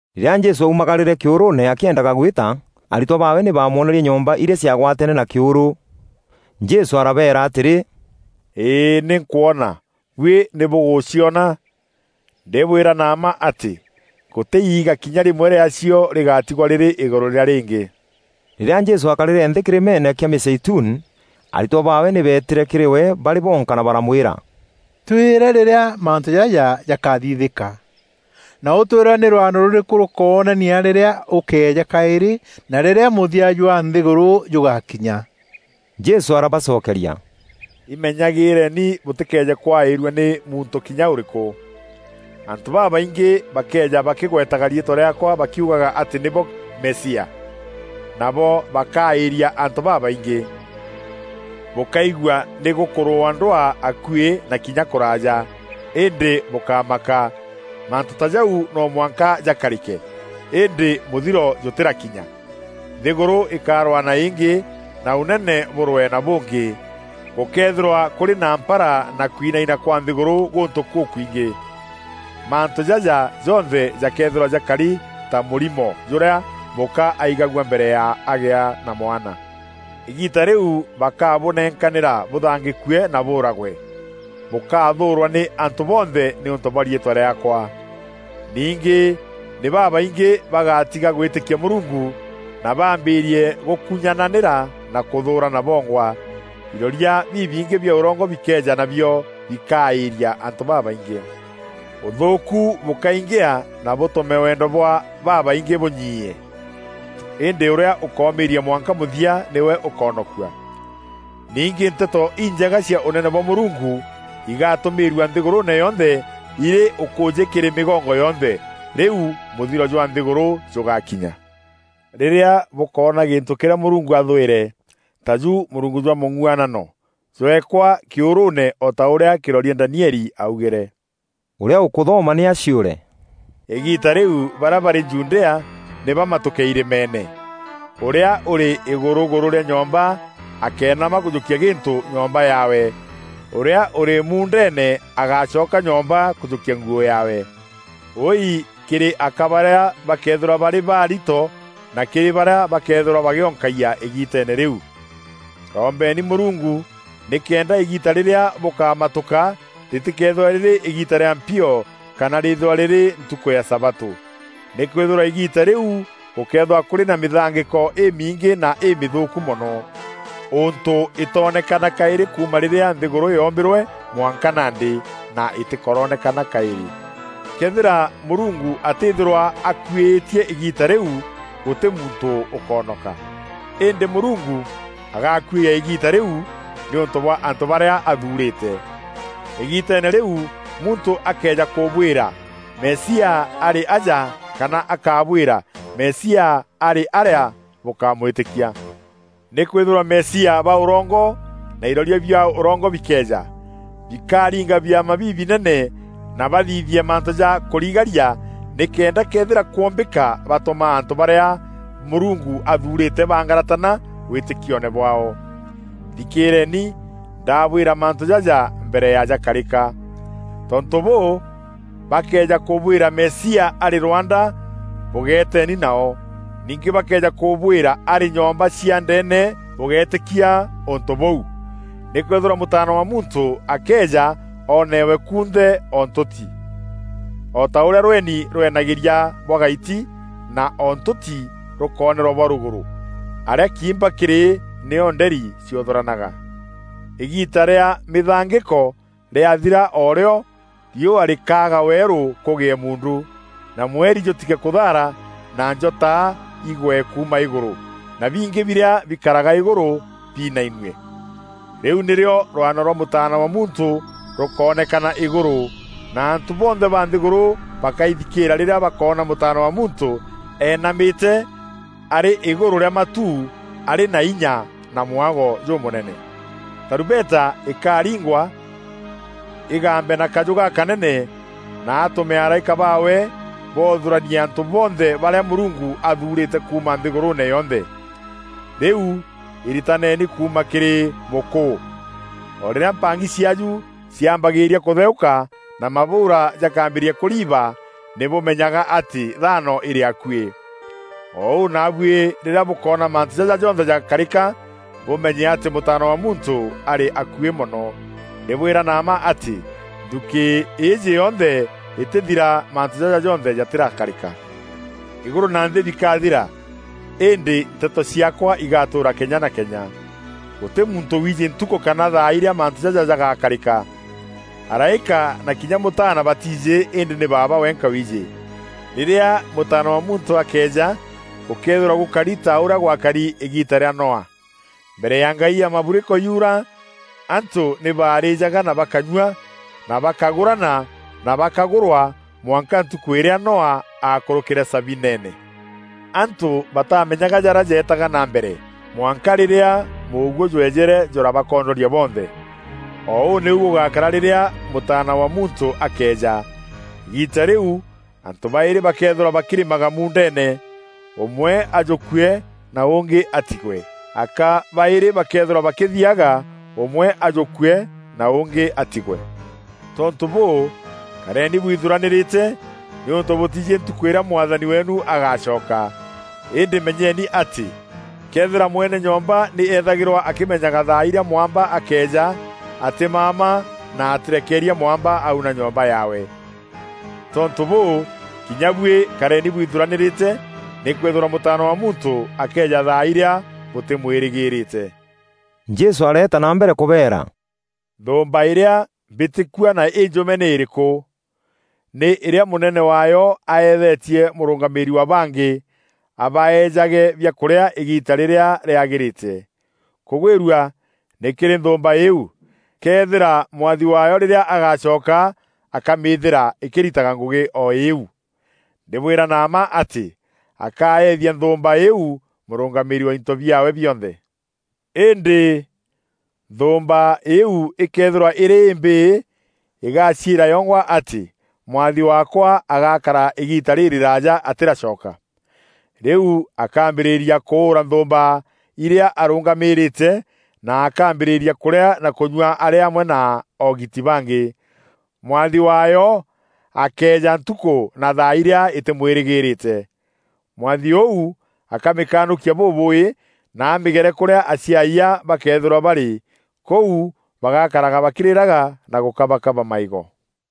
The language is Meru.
Rîrîa Jesû aaumagarîre kîûrûûne akîendaga gwîta, aritwa baawe nî baamwonerie nyomba irîa ciaagwateene na kîûrû. Jesû arabeera atîrî, “Îî, nî nkwona. Buî nî bûgûcîona? Ndîbwîra na mma atî, gûtî iiga kinya rîmwe rîaacio rîgatîgwa rîrî îgûrû rîa rîngî.” Rîrîa Jesû aakarîre nthî kîrîmeene kîa Mîzeituni, aritwa baawe nî beetîre kîrî we barî bonka na baramwîra, “Twîre rîrîa mantû jaja jakathithîka, na ûtwîre nî rwano rûrîkû rûkoonania rîrîa ûkeeja kaîrî na rîrîa mûthia jwa nthîgûrû jûgakinya.” Jesû arabacokeria, “Imenyagîîreni bûtîkeeje kwaîrua nî muntû kinya ûrîkû. Antû babaingî bakeeja bakîgwetaga riîtwa rîaakwa bakiugaga atî nîbo Mesia. Nabo bakaaîria antû babaingî. Bûkaigua nî gûkûrûûwa ndwaa akuî na kinya kûraaja, îndî bûkámaka. Mantû ta jau no mwanka jakarîke, îndî mûthiro jûtîrakinya. Nthîgûrû îkarwaa na îngî, na ûnene bûrwee na bûngî. Gûkeethîrwa kûrî na mpara na kwinaina kwa nthîgûrû gûntû gûkwingî. Mantû jaja jonthe jakeethîrwa jakari ta mûrîmo jûrîa mûka aigagua mbere ya agîa na mwana. “Îgiita rîu bakabûnenkanîîria bûthangîkue na bûûragwe. Bûkathûûrwa nî antû bonthe nîûntû bwa riîtwa rîaakwa. Ningî nî babaingî bagatîga gwîtîkia Mûrungu, na baambîîrie gûkunyananîra na kûthûûrana bongwa. Iroria bibingî bia ûrongo bikeeja nabio bikaaîria antû babaingî. Ûthûûku bûkaingîa na bûtûme wendo bwa babaingî bûnyiie. Îndî ûrîa ûkomîîria mwanka mûthia nîwe ûkoonokua. Ningî Nteto Injega cia Ûnene bwa Mûrungu igatûmîîrua nthîgûrûûne yonthe irî ûkûûjî kîrî mîgongo yonthe. Rîu mûthiro jwa nthîgûrû jûgakinya. “Rîrîa bûkoona gîntû kîrîa Mûrungu athwîre, taju mûrungu jwa mûng'uanano, jweekwa kîûrûûne o ta ûrîa kîroria Danieli augîre, (ûrîa ûkûthoma nî aciûre). Îgiita rîu barîa barî Judea nî bamatuke irîmeene. Ûrîa ûrî îgûrûgûrû rîa nyomba akéenama kûjûkia gîntû nyomba yaawe. Ûrîa ûrî muundeene agácoka nyomba kûjûkia nguû yaawe. Wûûi kîrî aka barîa bakeethîrwa barî baarito na kîrî barîa bakeethîrwa bagîonkagia îgiiteene rîu. Rombeeni Mûrungu nîkenda îgiita rîrîa bûkamatûka rîtîkeethîrwe rîrî rîa mpio kana rîîthîrwa rîrî ntukû ya sabatû. Nîkwîthîrwa îgiita rîu gûkeethîrwa kûrî na mîthangîko îmingî na îmîthûûku mono, ûntû îtoonekana kaîrî kuuma rîrîa nthîgûrû yoombîrwe mwanka nandî, na îtîkoronekana kaîrî. Këethîra Mûrungu atîthîrwa akuîîtie îgiita rîu, gûtî muntû ûkonoka. Îndî Mûrungu agakuîîa îgiita rîu nîûntû bwa antû barîa athuurîte. Îgiiteene rîu muntû akëeja kûbwîra: ‘Mesia arî aja’ kana akabwîra, ‘Mesia arî aarîa,’ bûkámwîtîkia. Nîkwîthîrwa Mesia ba ûrongo na iroria bia ûrongo bikeeja. Bikariinga biama bibinene na bathithie mantû ja kûrigaria nîkenda këethîra kwombîka batûma antû barîa Mûrungu athuurîte bangaratana wîtîkioone bwaao. Thikîîreeni, ndabwîra mantû jaja mbere ya jakarîka. Tontû bûû, bakëeja kûbwîra, ‘Mesia, arî rwanda,’ bûgeteni nao; ningî bakëeja kûbwîra ‘Arî nyomba cia ndeene,’ bûgéetîkia ûntû bûu. Nîkwîthîrwa Mûtaana wa Muntû akeeja oonewe kunthe o ntûti, o ta ûrîa rweni rwenagîria bwa gaiti, na o ntûti rûkoonerwa bwa rûgûrû. Arîa kiimba kîrî, nîo nderi ciûthûranaga. “Îgiita rîa mîthangîko rîathîra o rîo, riûa rîkaaga weerû kûgîe muundu, na mweri jûtige kûthaara na njota igwe kuuma îgûrû, na bingî birîa bikaraga îgûrû biinainue. Rîu nîrîo rwano rwa Mûtaana wa Muntû rûkoonekana îgûrû, na antû bonthe ba nthîgûrû bakaithikîîra rîrîa bakoona Mûtaana wa Muntû enamîte arî îgûrû rîa matu, arî na inya na mwago jûmûnene. Tarumbeta îkaringwa îgambe na kajû gakanene na atûme araîka baawe boothûranie antû bonthe barîa Mûrungu athuurîte kuuma nthîgûrûûne yonthe. “Rîu iritaneeni kuuma kîrî mûkûû: O rîrîa mpang'i ciaaju ciambagîîria kûtheûka, na mabûûra jakambîrîria kûriiba nî bûmenyaga atî, thano îrî akuî. O ûu naabuî rîrîa bûkoona mantû jaja jonthe jakarîka, bûmenye atî Mûtaana wa Muntû arî akuî mono. Ndîbwîra na mma atî, nthukî îîjî yonthe îtîthira mantû jaja jonthe jatîrakarîka. Îgûrû na nthî bikathira, îndî nteto ciaakwa igatûûra kenya na kenya. “Gûtî muntû wiijî ntukû kana thaa irîa mantû jaja jagakarîka. Araîka na kinya Mûtaana batiijî îndî nî Baaba wenka wiijî. Rîrîa Mûtaana wa Muntû akeeja gûkeethîrwa gûkari ta ûrîa gwakari îgiita rîa Noa. Mbere ya ngai ya maburiko yuura, antû nî barîîjaga na bakanyua, na bakagûrana na bakagûrwa, mwanka ntukû îrîa Noa aakûrûkîre sabineene. Antû batamenyaga jarîa jeetaga na mbere, mwanka rîrîa mûguû jweejîre jûrabakondoria bonthe. O ûu nîu gûgakara rîrîa Mûtaana wa Muntû akeeja. Îgiita rîu antû baîrî bakeethîrwa bakîrîmaga muundeene, ûmwe ajûkûe na ûngî atîgwe. Aka baîrî bakeethîrwa bakîthiaga, ûmwe ajûkûe na ûngî atîgwe. Tontû bûû, kareni bwithuranîrîte, nîûntû bûtiijî ntukû îrîa Mwathani weenu agacoka. Îndî menyeni atî, këethîra mwene nyomba nî ethagîrwa akîmenyaga thaa irîa mwamba akeeja, atîmama, na atîrekeeria mwamba auna nyomba yaawe. Tontû bûû, kinya buî kareni bwithuranîrîte nîkwîthîrwa Mûtaana wa Muntû akeeja thaa irîa bûtîmwîrîgîrîte.” Jesû areeta na mbere kûbeera, “Nthûûmba îrîa mbîtîkua na înjûme nî îrîkû? Nî îrîa mûnene waayo aethetie mûrûngamîîri wa bangî, abaejage biakûrîa îgiita rîrîa rîagîrîte. Kûgwîrua nî kîrî nthûûmba îîu, këethîra mwathi waayo rîrîa agacoka, akamîîthîra îkîritaga ngûgî o îîu. Ndîbwîra na mma atî akaethia nthûûmba îîu mûrûngamîîri wa into biaawe bionthe. Îndî nthûûmba îîu îkëethîrwa îrî îmbîî, îgacîîra yongwa atî, ‘Mwathi waakwa agakara îgiita rîrîraja atîracoka.’ Rîu akaambîrîria kûûra nthûûmba irîa arûngamîrîte, na akaambîrîria kûrîa na kûnyua arî amwe na oogiti bangî. Mwathi waayo akeeja ntukû na thaa irîa îtîmwîrîgîrîte. Mwathi ûu akamîkanûkia bûbûuî, na amîgere kûrîa aciayia bakeethîrwa barî. Kûu bagakaraga bakîrîraga na gûkabakaba maîgo.